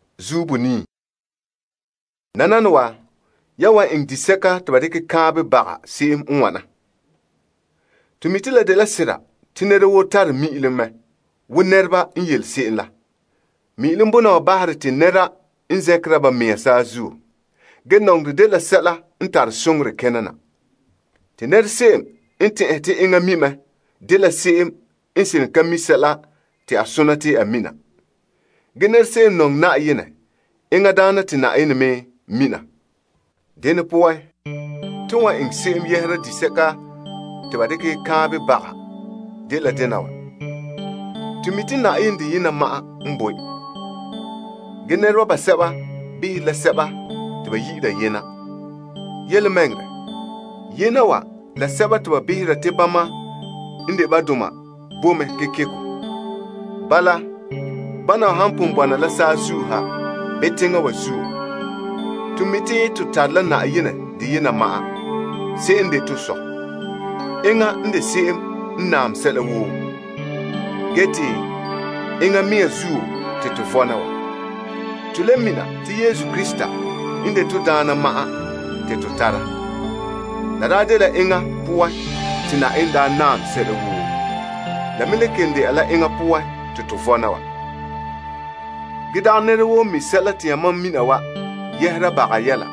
Tɔ. Nananawa yan wan eŋɛ disɛka te ba dekɛ kaanbɛ baga se'em n wana. To mi' te la de sera te nɛra woo tare mi'ilom mɛ wo nɛreba n yele se'em la. Mi'ilom bona wa bahere te nɛra n zɛnkera ba mea saazuo. Ge, nɔŋerɛ dela sɛla n tare soŋorɛ kena na. Te nɛra se'em n tɛn'ɛhe te enŋa mi' mɛ dela se'em n seren ka mi' sɛla te a sona te a mina. Ge, nɛra se'em n nɔŋɛ Na'ayenɛ, enŋa daana te Na'ayenɛ me mina. Dene poan, to wan eŋɛ se'em yɛhera disɛka te ba dekɛ kaanbɛ baga dela dena wa. To mi' te Na'ayenɛ deyena ma'an n boe. Ge nɛreba basɛba han ta behere la sɛba te ba yi'ire yena. Yelemɛŋɛrɛ, yena wa la sɛba te ba behera te bama n de ba doma bo mɛ kekeko. Bala, bana wa han pon bɔna la saazuo ha, bii teŋa wa zuo, to mi' te to tare la Na'ayenɛ deyena ma'an se'em n de to Sɔ'. Enŋa n de se'em n naam sɛla woo, gee te enŋa mea zuo te to vɔna wa. To le mina te Yesu Krista n de to Daana ma'an te to tara. La daa dela enŋa poan te Na'ayenɛ daa naam sɛla woo. La me le kelom de'a la enŋa poan te to vɔna wa. Ge dagɛ nɛra woo n mi' sɛla te yamam mina wa yɛhera baga yɛla.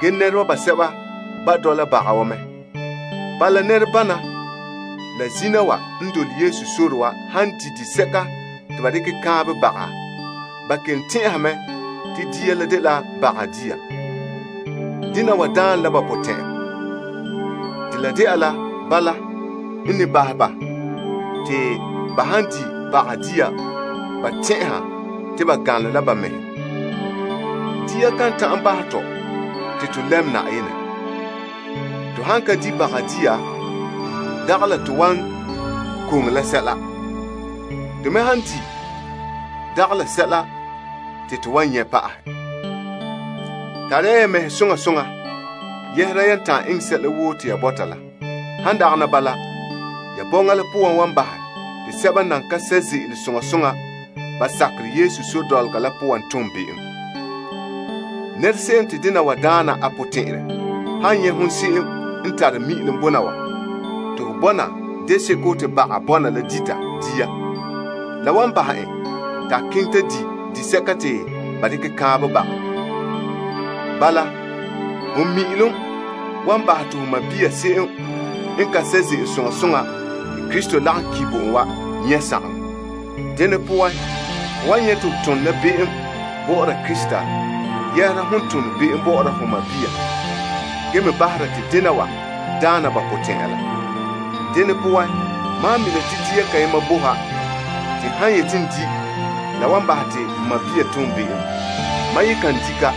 Ge nɛreba basɛba ba' dɔla baga wa mɛ zo'e zo'e. Bala, nɛrebana la n dole Yesu sore wa han di' disɛka te ba dekɛ kaanbɛ baga, ba kelom tɛn'ɛha mɛ te dia la dela baga dia. Dena wa daane la ba potɛn'ya. Te la de'a la bala n ne bahɛ ba te ba han di' baga dia ba tɛn'ɛha te ba ganlom la ba mɛhe. Dia kan ta'an bahɛ tɔ te to lɛm Na'ayenɛ. To han ka di' baga dia, dagɛ la to wan koŋe la sɛla. To me han di' dagɛ sɛla te to wan nyɛ' pa'ahɛ. Tare ya ya mɛhe soŋa soŋa yɛhera yan ta'an eŋɛ sɛla woo te ya bɔta la. Han dagana bala, ya bɔŋa la poan wan bahɛ te sɛba n nan ka sɛ' ze'ele soŋa soŋa ba sakerɛ Yesu sore dɔlɔga la poan tom be'em. Nɛra se'em te dena wa daana a potɛn'ɛrɛ han nyɛ' hon se'em n tare mi'ilom bona wa te ho bɔna deseko te baga bɔna la dita dia, la wan bahɛ en te a keŋɛ ta di' disɛka te ba dekɛ kaanbɛ baga. Bala, ho mi'ilom wan bahɛ te ho sɔɔn se'em n ka sɛ' ze'ele soŋa soŋa te Krista lagom ki' bo en wa nyɛ' sagaŋɔ. Dene poan, ho wan nyɛ' to ho tone la be'em bɔ'ɔra Krista yɛhera hon tone be'em bɔ'ɔra ho sɔɔnrɔ, gee me bahera te dena wa daana ba potɛn'ya la. Dene poan, mam han mina te dia kayema bo ha te n han yete n di' la wan bahɛ te n sɔɔn tom be'em, mam ye kan di' ka.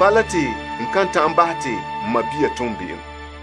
Bala, te n kan ta'an bahɛ te n sɔɔn tom be'em.